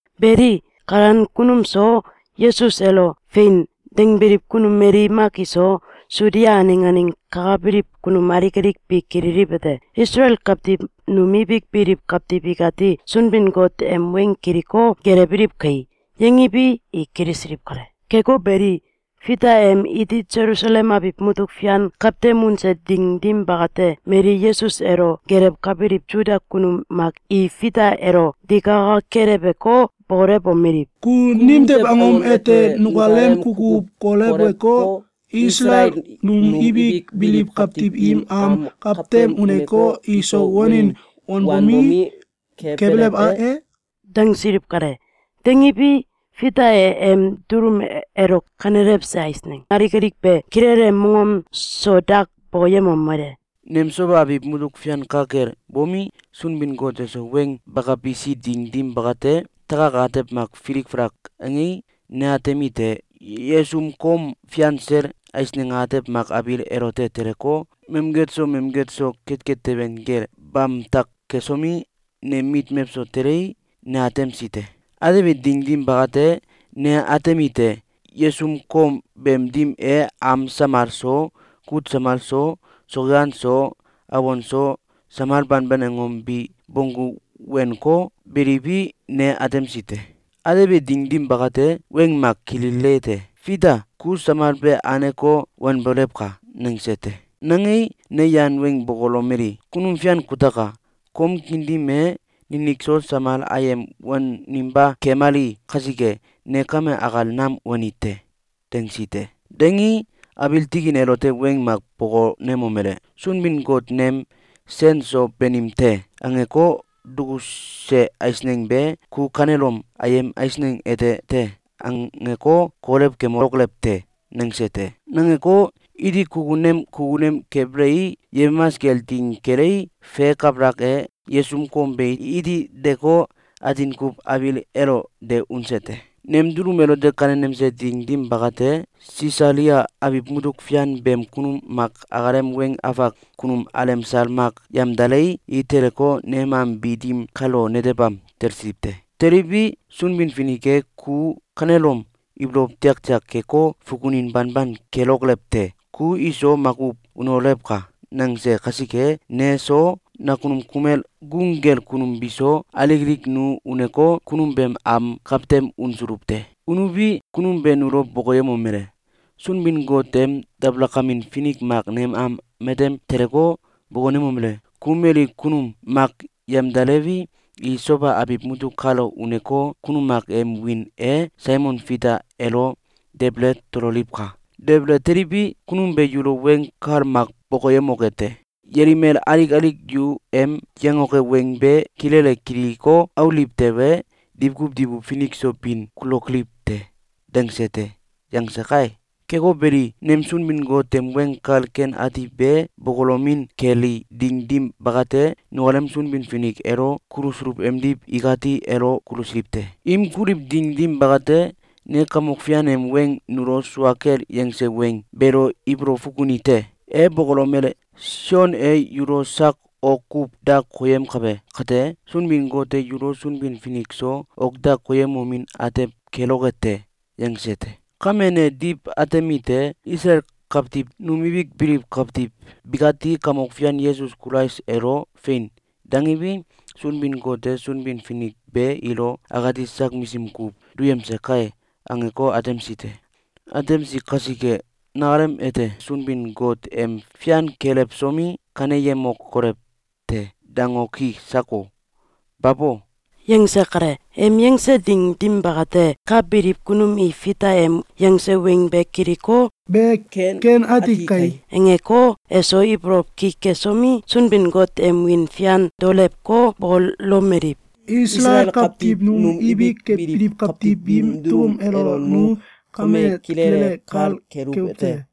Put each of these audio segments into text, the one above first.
Beli, kalan kunum so, Yesus elo “Fein!”, dangbiliw kunum mali mak iso, Sudia aneng aneng kakabiliw kunum alik alik bi kililiwete: “Isalael kawtiw num ibik biliw kawtiw ikati Sunbin-Got em weng kiliko, gelewbiliw kai!”, yangiwi, i kilisiliw kale. Keko beli, Fita em iti Selusalem abiw mutuk fian kawtem unse ding dim bakate, mali Yesus elo gelewkabiliw Suda kunum mak i Fita elo digaka keleweko, bokolewomeliw: “Ku nimtew angom ete nukalem kukuw koleweko, Isalael num ibik biliw kawtiw im am kawtem uneko, iso wanin wanbomi, kebelew e?”, dangsiliw kale. Dangiwi, Fita e em dulum elo kanelewse eisneng alik alik be kilele mongom so dak bokoyemomele: “Nem Soba abiw mutuk fian ka kel bomi, Sunbin-Got eso weng bakabisi ding dim bakate, takak atew mak filik falak angei, ne atemite: Yesum kom fian sel eisneng atew mak abiil elote teleko, mamget so mamget so ketket teben kel bamtak kesomi, nem mit mewso telei, ne atemsi te. Atebi ding dim bakate, ne atemite: Yesum kom beem dim e am samal so, kut samal so, sokyan so, awon so, samal banban angom bi bonggu wenko, beliwi, ne atemsi te. Atebi ding dim bakate, weng mak kililite: ‘Fita! Ku samal be anko, wanbolewka!’, nangese te. Nangei, ne yan weng bokolomeli: ‘Kunum Fian kutaka! Kom kiin dim e ninik so samal ayem waninba kemali kasike, ne kame akal nam wani te.’, dangsi te. Dangii, abiil tikin elote weng mak bokonemomele: ‘Sunbin-Got nem ‘Sen so banim te!’, angeko, dukuse eisneng be, ku kanelom ‘Ayem eisneng ete te!’, angeko, kolew kemokolew te!’, nangese te. Nangeko, iti kukunem kukunem kebelei, yemamas kel ding kelei, fe kabalak e, yesum kom be iti deko, atin kuw abiil elo de unese te. Nem dulum elo kanenemse ding dim bakate, Sisalia abiw mutuk fian beem kunum mak akalem weng afak kunum alemsal mak yamdalei, i teleko, nem am bi dim kalo netebam talsiliw te. Teliwi, Sunbin-Finik e ‘Ku kanelom ibolow tiaktiak keko, fukunin banban kelokolew te! Ku iso makuw unolewka!’, nangese kasike, ne so, nakunum kumel gung kel kunum biso, alik alik nu uneko, kunum beem am kawtem unsuluw te. Unuwi, kunum be nulo bokoyemomele: ‘Sunbin-Got em dabalakamin finik mak nem am matem teleko, bokonemomele: ‘Ku mali kunum mak yamdalewi, i Soba abiw mutuk kalo uneko, kunum mak em wiin e Saimon Fita elo debele tololiwka! Debele teliwi, kunum be yulo weng kal mak bokoyemoke te. Yelimel alik alik yu em yangoke weng be kilele kiliko, auliw tewe, diwkuw diwkuw finik so bin kulokoliw te.’, dangse te.’, yangse kai. Keko beli, nem Sunbin-Got em Weng Kal Ken Ati be bokolomin keli ding dim bakate, nukalem Sunbin-Finik elo kulusuluw emdiw ikati elo kulusiliw te. Im kuliw ding dim bakate, ne Kamok Fian em weng nulo sua kel yangse weng beelo ibolow fukuni te. E bokolomele: ‘Sion e yulo sak ok kuw da koyemkabe kate, Sunbin-Got e yulo Sunbin-Finik so ok da koyemomin atew keloke te.’, yangse te. Kame ne diw atemite: ‘Isalael kawtiw num ibik biliw kawtiw bikati Kamok Fian Yesus Kulais elo ‘Fein!’, dangiwi, Sunbin-Got e Sunbin-Finik be ilo akati sak misim kuw duyemse kai!’, angeko, atemsi te. Atemsi kasike, nakalem ete Sunbin-Got em fian kelewsomi, ‘Kaneyemokolew te!’, dangoki sako? Babo!”, yangse kale. Em yangse ding dim bakate, ka biliw kunum i Fita em yangse weng be kiliko, “Be ken ati kai!”, angeko, eso ibolow ki kesomi, Sunbin-Got em wiin fian daolewko, bokolomeliw: “Isalael kawtiw num ibik biliw kawtiw biim dulum elo nu kame kilele kal keluwete: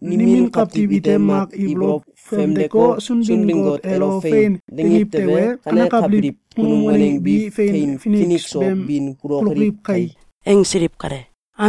Nimin kawtiw ite mak ibolow famdeko, Sunbin-Got elo ‘Fein!’, dangiw tewe, kanekabiliw kunum waneng bi fein finik so bin kulokoliw kai!”, angsiliw kale.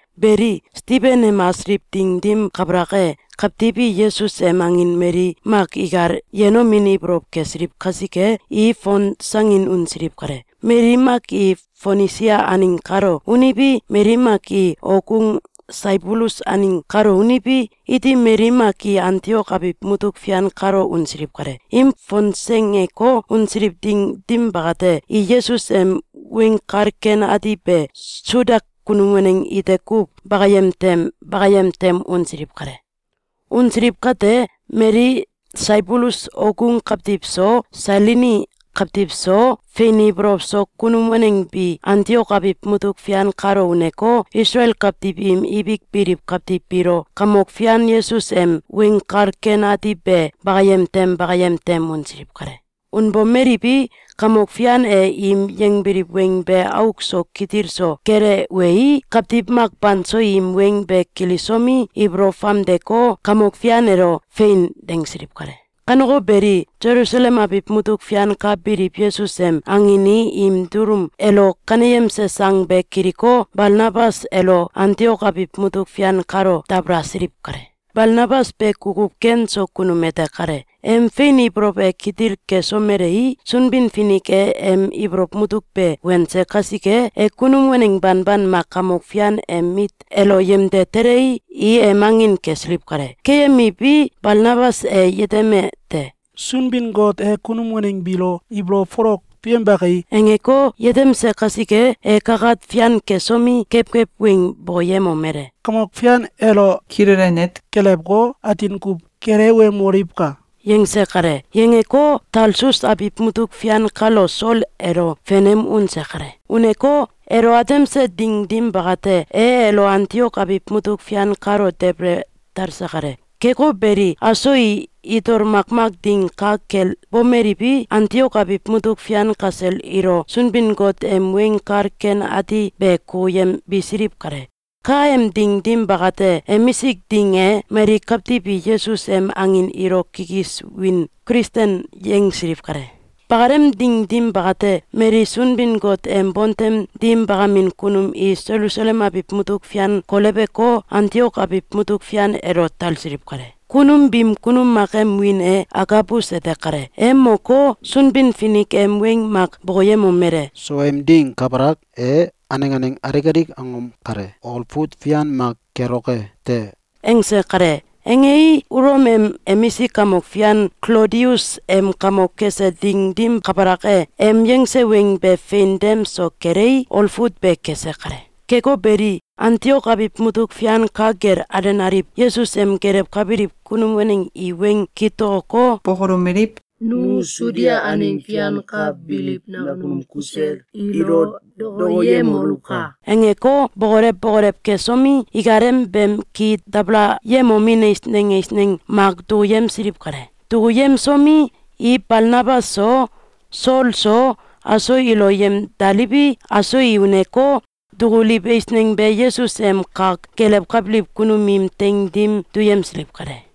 Beli, Stiben em asiliw ding dim kabalak e, kawtiw i Yesus em angin mali mak ikal yenomin ibolow kesiliw kasike, i fonsangin unsiliw kale. Mali mak i Fonisia aneng kalo uniwi, mali mak i okgung Saibulus aneng kalo uniwi, iti mali mak i Antiok abiw mutuk fian kalo unsiliw kale. Im fonsengeko, unsiliw ding dim bakate, i Yesus em Weng Kal Ken Ati be Suda kunum waneng ite kuw bakayem tem bakayem tem unsiliw kale. Unsiliw kate, mali Saibulus okgung kawtiw so, Sailini kawtiw so, fein ibolow so kunum waneng bi Antiok abiw mutuk fian kalo uneko, Isalael kawtiw im ibik biliw kawtiw biilo Kamok Fian Yesus em Weng Kal Ken Ati be bakayem tem bakayem tem unsiliw kale. Unbomeliwi, Kamok Fian e im yangbiliw weng be auk so kitil so kelewei, kawtiw mak banso im weng be kilisomi, ibolow famdeko, Kamok Fian elo “Fein!”, dangsiliw kale. Kaneko beli, Selusalem abiw mutuk fian ka biliw Yesus em angin i im dulum elo kaneyemse sang be kiliko, Balnabas elo Antiok abiw mutuk fian kalo dabalasiliw kale. Balnabas be kukuw ken so kunum ete kale. Em fein ibolow e kitil kesomelei, Sunbin-Finik e em ibolow mutuk be wense kasike, e kunum waneng banban mak Kamok Fian em mit elo yemde telei, i em angin kesiliw kale. Keyemiwi, Balnabas e yetemete: “Sunbin-Got e kunum waneng biilo ibolow folok duyembe kai!”, angeko, yetemse kasike, e kakat fian kesomi, kewkew weng bokoyemomele: “Kamok Fian elo kilele net kelewko, atin kuw gelewemoliwka!”, yangse kale. Yangeko, Talsus abiw mutuk fian kalo Sol elo fenem unse kale. Uneko, elo atemse ding dim bakate, e elo Antiok abiw mutuk fian kalo debele talse kale. Keko beli, aso i itol makmak ding ka kel bomeliwi, Antiok abiw mutuk fian kasel ilo Sunbin-Got em Weng Kal Ken Ati be kukuyembisiliw kale. Kaem ding dim bakate, emisik ding e, mali kawtiw i Yesus em angin ilo kikis wiin “Kilisten” yangsiliw kale. Bakalem ding dim bakate, mali Sunbin-Got em bontem dim bakamin kunum i Selusalem abiw mutuk fian koleweko, Antiok abiw mutuk fian elo talsiliw kale. Kunum biim kunum mak em wiin e Agabus ete kale. E moko, Sunbin-Finik em weng mak bokoyemomele: “Sowem ding kabalak e, aneng aneng alik alik angom kale olfut fian mak keloke te.”, angse kale. Angei, Ulom em emisik kamok fian Klodius em kamok kese ding dim kabalak e, em yangse weng be fein dem so kelei, olfut be kese kale. Keko beli, Antiok abiw mutuk fian ka kel alenaliw Yesus em gelewkabiliw kunum waneng i weng kitokoko, bokolomeliw: “Nu Sudia aneng fian ka biliw nakunum kusel ilo dokoyemoluwka!”, angeko, bokolew bokolew kesomi, ikalem beem ki dabalayemomin eisneng eisneng mak dukuyemsiliw kale. Dukuyemsomi, i Balnabas so, Sol so, aso ilo yemdaliwi, aso i uneko, dukuliw eisneng be Yesus em kak gelewkabiliw kunum im teing dim duyemsiliw kale.